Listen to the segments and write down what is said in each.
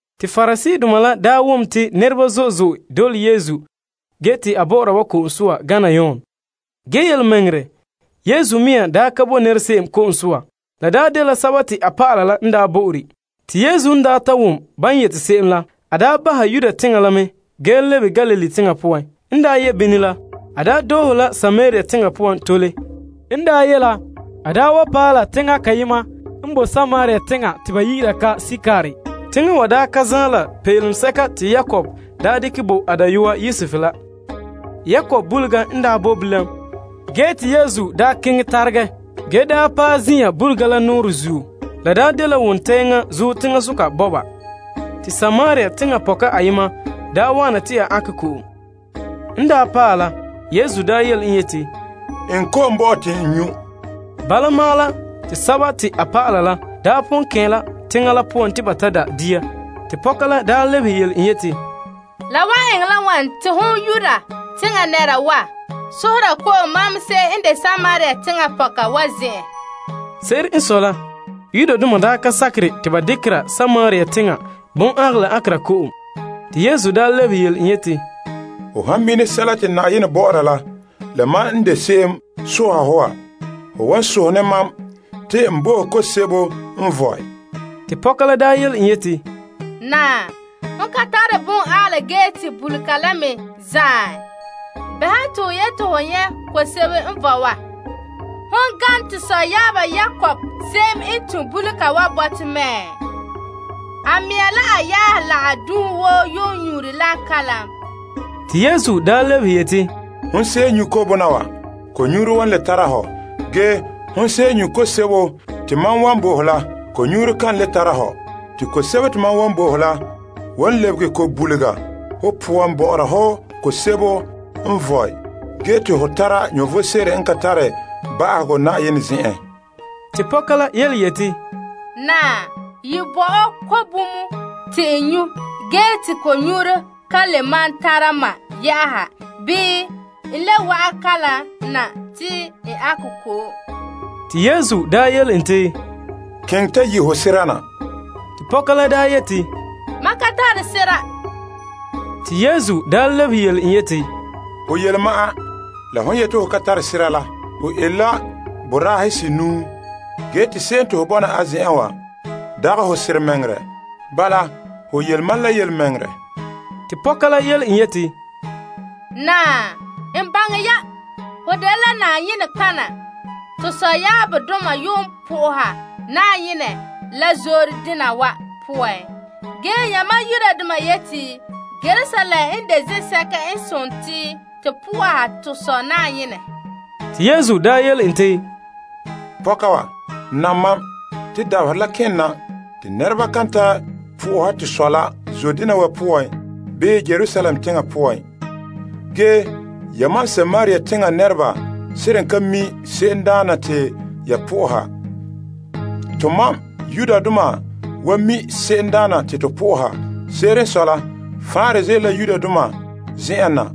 Te Pariseedoma la daa wom te nɛreba zo'e zo'e dole Yesu ge te a bɔ'ɔra ba ko'om soa gana Yon. Ge yelemɛŋɛrɛ, Yesu mea daa ka bo nɛrese'em ko'om soa. La dela a dɔlɔba la n bo'ore. Te Yesu n ta wom ban yeti se'em la, a bahɛ Yudea teŋa la ge lebe Galilee teŋa poan. N ye' bini la, a doohe la Samaria teŋa poan tole. A paɛ la teŋa kayema n boe Samaria teŋa te ba yi'ira ka Sikar. Teŋa wa ka zaan la peelom sɛka te Yakob daa dekɛ bo a dayɔa Yosef la. Yakob bulega n boe bilam, ge Yesu keŋɛ taregɛ mɛ ge daa paɛ zin'an bulega la kenkɛleŋa. La de wo wontɛŋa zuo teŋasoka bɔba. Samaria teŋa pɔka ayema nya wa'ana te a ankɛ la ko'om. En daa paɛ la, Yesu yele en yeti, Eŋɛ ko'om bo mam te n nyu'. Bala ma'an la, te a dɔlɔba la pon kɛn' la teŋa la poan te ba da' dia. Te pɔka la lebehe yele en yeti, La wan eŋɛ la wane te hon Yuda teŋa nɛra wa sohora ko'om mam se'em n de Samaria teŋa pɔka wa? Se'ere n sɔe la, Yudoma dekɛ Samaria teŋa lɔgɔrɔ woo te to dɛna dɛngerɔ. Te Yesu lebehe yele en yeti, Ho han mina sɛla te Yenɛ bɔ'ɔra la la mam n de se'em sohɛ hɔ wa, ho wan sohɛ ne mam, te n bo ho ko'om sebo n vɔe. Te pɔka la yele en yeti, Naa, ho ka tare bon'angɛla ge te bulega la me zaan. Bɛha te ho yeti ho nyɛ' ko'om sebo n vɔe wa? Hon gane to sɔyaaba Yakob se'em n tun' bulega wa bo to la mɛ? A mɛŋa la a yaahe la a dunhe woo yuun nyuure la kalam. Te Yesu lebehe yeti, Hon se'em nyu' ko'bona wa, ko'nyuuro wan le tara hɔ. Ge, hon se'em nyu' ko'om sebo te mam wan bo ho la, ko'nyuuro kan le tara hɔ. Te ko'om sebo te mam wan bo ho la wan lebege ko'bulugɔ ho poan bɔ'ɔra hɔ ko'om sebo n vɔe ge te ho tara vom sebo n ka tare ba'ahegɔ Yenɛ zen'en. Te pɔka la yeti, Naa, ye bo mam ko'bomɔ te n nyu', ge te ko'nyuuro ka le maan tara mam, bii n le wa'an kalam na te n ankɛ ko'om. Te Yesu yele en te, Keŋɛ ta yi' ho sera na. Te pɔka la yeti, Mam ka tare sera. Te Yesu lebehe yele en yeti, Ho yele ma'an la hon yeti ho ka tare sera la. Ho ele la boraahe senuu, ge te se'em te ho nya bɔna a zen'en wa, dagɛ ho seramɛŋɛrɛ. Bala, ho yele mam la yelemɛŋɛrɛ. Te pɔka la yeti, Naa, n baŋɛ ya, ho dela nɔtɔgɔha. To sɔyaabdoma yuun na'ahe Yenɛ la zoore dena zuo. Ge, yamam Yudoma yeti Yerusalem n de zen'sɛka n sontii to na'aha to Sɔ Yenɛ. Te Yesu yele en te, Pɔka wa, nam mam. Te dabaherɛ la ken na te nɛreba kan ta na'aha to Sɔ la zoore dena wa zuo, bii Yerusalem teŋa poan. Ge yamam Samaria teŋa nɛreba seren ka mi' se'emdaana te ya na'aha. Tomam Yudoma wa mi' se'emdaana te to na'aha. Se'ere n sɔe la, faanrɛ ze'ele la Yudoma zen'an na.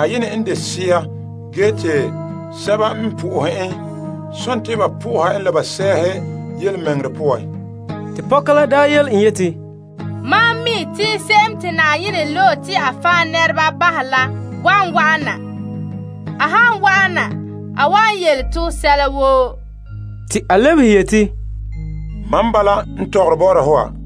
Yenɛ dela sea, ge te sɛba n na'ahɛ en la, sontii ba na'ahɛ en la ba sɛɛhe la yelemɛŋɛrɛ poan. Te pɔka la daa yele en yeti, Mam mi' te se'em te Yenɛ loe la, wan wa'ana. A han wa'ana, a wan yele to sɛla woo. Te a lebehe yeti, Mam n bala n tɔgɔre bɔ'ɔra ho wa.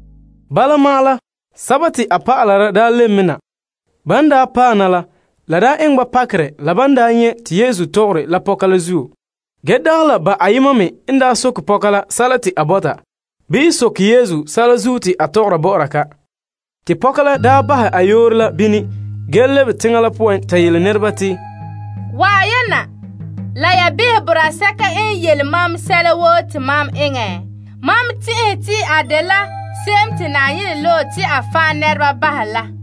Bala ma'an la, a dɔlɔba la daa lebe na. Ban daa paɛ na la, la eŋɛ ba pakerɛ, la ban nyɛ' te Yesu tɔgɔre la pɔka la. Ge, dagɛ la ba ayema me n soke pɔka la sɛla te a bɔta, bii soke Yesu sɛla zuo te a tɔgɔra bɔ'ɔra ka. Te pɔka la bahɛ a yoore la bini ge lebe teŋa poan ta yele nɛreba te, Wa'an ya na la ya behɛ boraa sɛka n yele mam sɛla woo te mam eŋɛ. Mam tɛn'ɛhe te a dela se'em te Yenɛ loe la.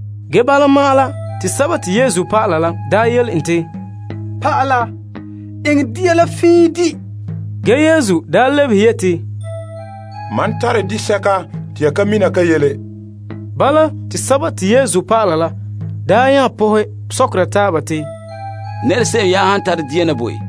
Ge bala ma'an la, te Yesu dɔlɔba la yele en te, Naa, eŋɛ dia la fiin di'. Ge, Yesu lebehe yeti, Mam tare disɛka te ya ka mina ka yele. Bala, te Yesu dɔlɔba la nya pɔhɛ sɔkera taaba te, Nɛrese'em ka tare dia na bo en?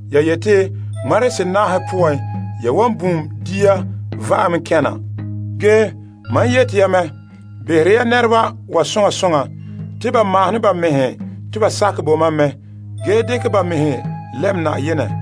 Ya yeti, ŋmarehe senaahe poan ya wan bum dia va'ame kɛn' na. Ge mam yeti ya mɛ, dia la pon bi'ɛ mɛ sekɛ buŋa. Behera nɛreba wa soŋa soŋa te ba mahone ba mɛhe te ba sakɛ bo mam mɛ, ge dekɛ ba mɛhe lɛm Na'ayenɛ.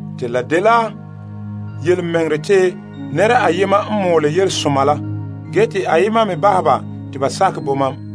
Te la dela yelemɛŋɛrɛ te nɛra ayema n bute la ge te ayema me bune.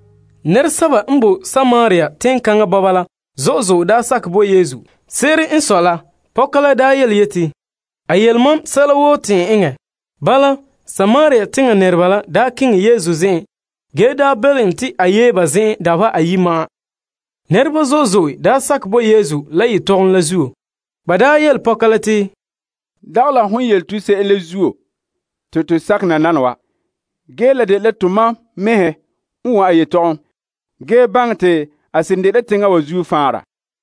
Nɛresɛba n boe Samaria teŋkaŋa bɔba la zo'e zo'e daa sakɛ bo Yesu. Se'ere n sɔe la, pɔka la yeti, A yele mam sɛla woo te n eŋɛ. Bala, Samaria teŋa nɛreba la keŋɛ Yesu zen'en ge belom en te a yee ba zen'en. Te a daa kɛn' la ba, dabeha ayi'. Nɛreba zo'e zo'e sakɛ bo Yesu la a yelehom la zuo. Ba yele pɔka la te, Dagɛ la hon yele to se'em la zuo te to sakɛ nananawa. Ge, la dela tomam mɛhe wom a yetɔgɔm, ge baŋɛ te a seren dela teŋa wa zuo faanra.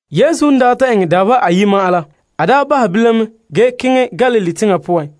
Yesu n daa ta eŋɛ dabeha ayi' ma'an la, a bahɛ bilam mɛ ge keŋɛ Galilee teŋa poan.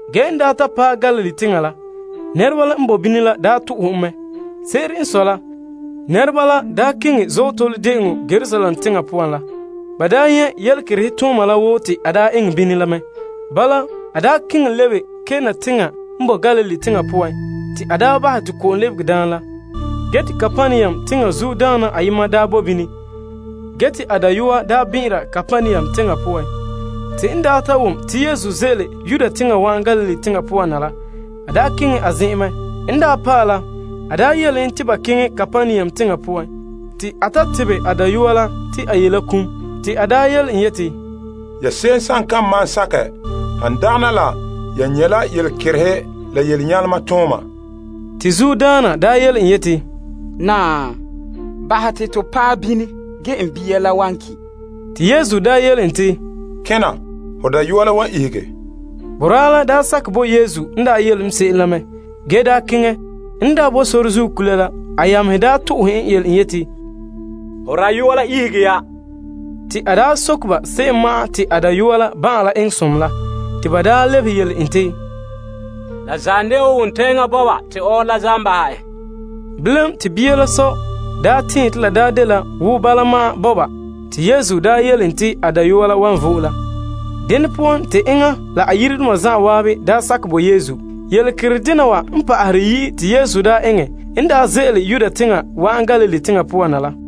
Ge n ta paɛ Galilee teŋa la, nɛreba la n boe bini la bo en zaarɛ. Se'ere n sɔe la, nɛreba la keŋɛ Azootole De'eŋɔ Yerusalem teŋa poan la, ba nyɛ' yelekerehe tooma la woo te a eŋɛ bini la mɛ. Bala, a nya keŋɛ lebe la Kana teŋa la n boe Galilee teŋa poan la te a bahɛ te ko'om lɛbege daam la. Ge te Kapernaum teŋa zuodaana ayema boe bini, te a dayɔa bɛn'ɛnra. Te n ta wom te Yesu ze'ele Yudea teŋa wa'an Galilee teŋa poan na la, a keŋɛ a zen'en ta belom en te ba keŋɛ Kapernaum teŋa poan, te a ta tebɛ a dayɔa n ye kum. Te a yele en yeti, Ya se'em kan malom sakɛ, han dagana la ya nyɛ' la yelekerehe la yelenyalema tooma. Te zuodaana daa yele en yeti, Naa, bahɛ te to paɛ bini ge n bia la wan ki'. Te Yesu daa yele en te, Kena, ho dayɔa la wan ihege. Boraa la daa sakɛ bo Yesu n yele en se'em la mɛ, ge daa keŋɛ. En boe sore zuo kula la, a yamehe to'ohɛ en yele en yeti, Ho dayɔa la ihege ya. Te a soke ba se'em ma'an te a dayɔa la ban'an eŋɛ som la. Te ba lebehe yele en te, La zam dela wo wontɛŋa bɔba ma'an te ɔɔrɔ la zam bahɛ en. Bilam, te bia la sɔ la daa tɛɛn te la dela wo bala ma'an bɔba te Yesu yele en te a dayɔa la wan ihege la. Dene poan, te enŋa la a yiredoma zan'an daa sakɛ bo Yesu. Yelekiridena wa n pa'ahere yi'i te Yesu daa eŋɛ n daa ze'ele Yudea teŋa wa'an Galilee teŋa poan la.